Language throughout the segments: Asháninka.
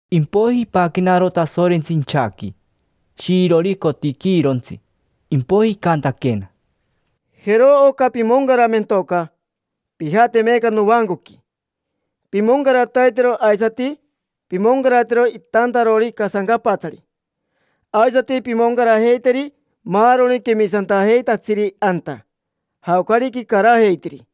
Impoiji ipaquenaro Tasorentsi inchaqui, shiirori cotiquiirontsi, impoiji icantaquena: —Jero oca pimoncaramentoca. Pijate meeca novancoqui, pimoncarataitero; aisati pimoncaratero itaantarori casancapatsari, aisati pimoncarajeiteri maaroni quemisantajeitatsiri anta, jaocarica icarajeitiri.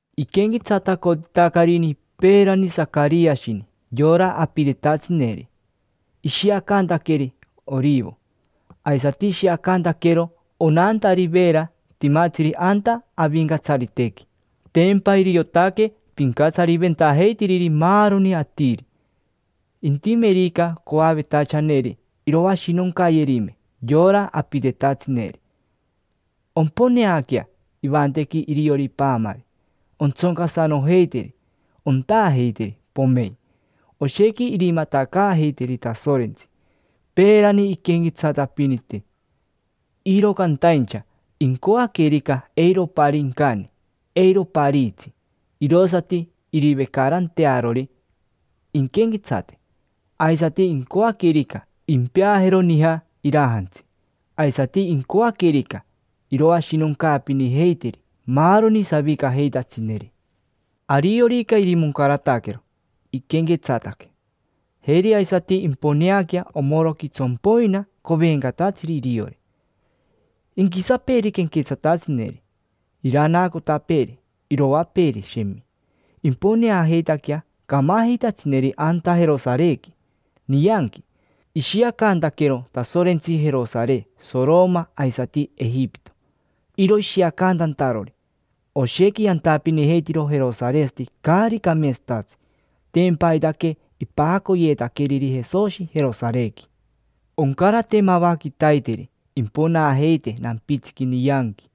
Iquenquetsatacotitacarini peerani Sacariashini yora apitetatsineri, ishiacantaqueri orivo. Aisati ishiacantaquero onantari veera timatsiri anta Avincatsaritequi. Tempa iriotaque pincatsariventajeitiriri maaroni atiri. Intimerica coavetachaneri iroashinoncayerime yora apitetatsineri, omponeaquea ivantequi iriori paamari, ontsoncasanojeiteri, ontaajeiteri, pomein. Oshequi irimatacaajeiteri Tasorentsi. Peerani inquenquetsatapinite, iro cantaincha incoaquerica eiro oparii incani, eiro opariitsi, irosati irivecarantearori inquenquetsate. Aisati, incoaquerica, impeajero nija irajantsi. Aisati incoaquerica, iroashinoncaapinijeiteri maaroni savicajeitatsineri. Ariorica irimoncarataquero inquenquetsate, jeri aisati imponeaquea omoroqui tsompoina covencatatsiri iriori. Inquisapeeri quenquetsatatsineri, iranaacotapeeri, iroapeeri, shemi. Imponaajeitaquea camajeitatsineri anta Jerosarequi, nianqui. Ishiacantaquero Tasorentsi Jerosare Soroma aisati Ejipito; iro ishiacantantarori, oshequi yantapinijeitiro jerosaresati caari cameetsatatsi. Tempa aitaque ipajacoyeetaqueriri Jesoshi Jerosarequi. Oncarate mava quitaiteri imponaajeite nampitsiqui nianqui,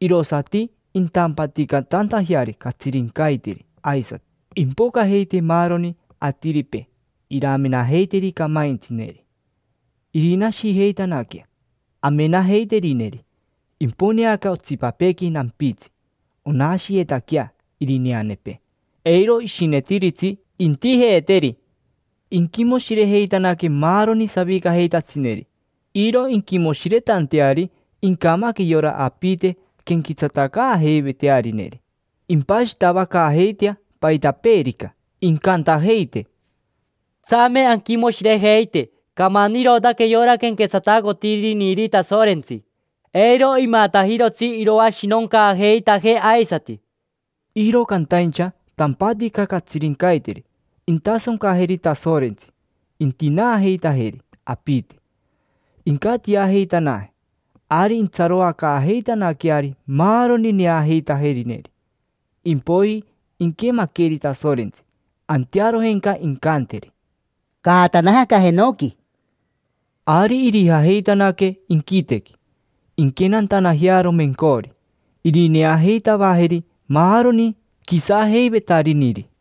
irosati intampaticatantajeari catsirincaiteri aisati. Impocajeite maaroni atiripee iramenajeiteri camaintsineri, irinashijeitanaquea amenajeiterineri: imponeaquea otsipapeequi nampitsi, onashiyetaquea irineanepee. Eiro ishinetiritsi intijeeteri. Inquimoshirejeitanaque maaroni savicajeitatsineri, iro inquimoshiretanteari incamaque yora apite quenquetsatacaajeivetearineri: impashitavacaajeitea paitapeerica. Incantajeite: —Tsame anquimoshirejeite. Camanirotaque yora quenquetsatacotiriniri Tasorentsi: eiro imatajirotsi iroashinoncaajeitajee aisati. Iro cantaincha tampatica catsirincaiteri intasoncajeri Tasorentsi, intinaajeitajeri apite, incatiajeitanaje. Ari intsaroacaajeitanaqueari maaroni neajeitajerineri. Impoiji inquemaqueri Tasorentsi, antearojenca incanteri: —Caatanaje aca jenoqui. Ari irijajeitanaque inquitequi, inquenantanajearo mencori; irineajeitavajeri maaroni quisajeivetariniri.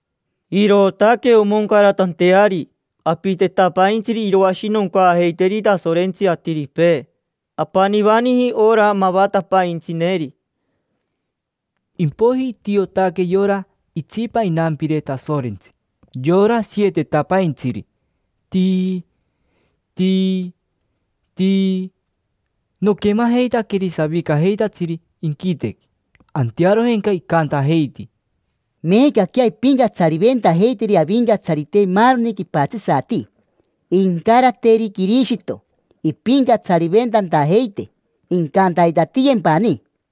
Irootaque omoncaratanteari apitetapaintsiri iroashinoncaajeiteri Tasorentsi atiripee. Apanivaniji ora mavatapaintsineri. Impoiji itiotaque yora itsipa inampire Tasorentsi, yora sietetapaintsiri: tii, tii, tii. Noquemajeitaqueri savicajeitatsiri inquitequi, antearojenca icantajeiti: Meecaquea impincatsariventajeiteri Avincatsarite maaroni quipatsisati, incarateri Quirishito impincatsariventantajeite, incantaitatiyempani.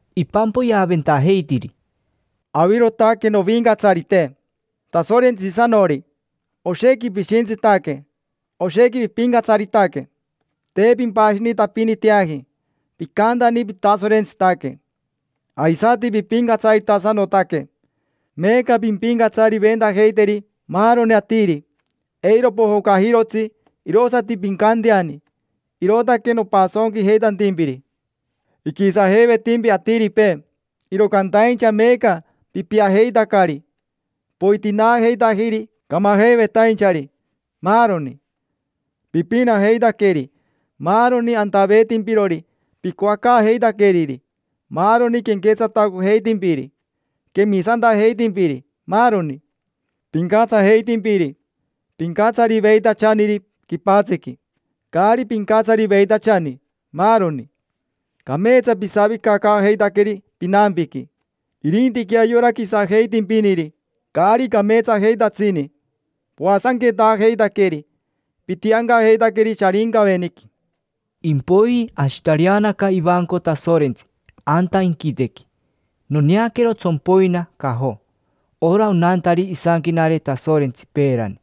Ipampoyeaventajeitiri: Avirotaque, Novincatsarite, Tasorentsisanori: oshequi pishintsitaque, oshequi pipincatsaritaque. Te pimpashinitapiniteaji, picantani pitasorentsitaque. Aisati pipincatsaritasanotaque, meeca pimpincatsariventajeiteri maaroni atiri; eiro pojocajirotsi, irosati pincanteani. Irootaque nopasonquijeitantimpiri. Iquisajeivetimpi atiripee, iro cantaincha meeca pipiajeitacari. Poitinaajeitajiri camajeivetainchari, maaroni: pipinajeitaqueri maaroni antaveetimpirori picoacaajeitaqueriri, maaroni quenquetsatacojeitimpiri, quemisantajeitimpiri, maaroni. Pincatsajeitimpiri, pincatsariveitachaniri quipatsiqui, caari pincatsariveitachani, maaroni. Cameetsa pisavicacaajeitaqueri pinampiqui. Irintiquea yora quisajeitimpiniri, caari cameetsajeitatsini, poasanquetaajeitaqueri, pitiancajeitaqueri Sharincaveniqui. Impoiji ashitareanaca ivanco Tasorentsi anta inquitequi, noneaquero tsompoina cajo, ora onantari isanquenare Tasorentsi peerani.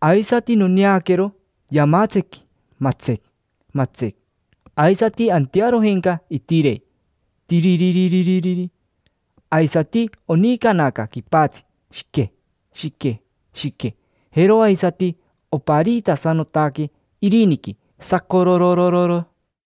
Aisati noneaquero yamatsequi, matsec, matsec; aisati antearojenca itirei, tiiriririri; aisati onicanaca quipatsi, shique, shique, shique; jero aisati opariitasanotaque iriniqui, sacorororo.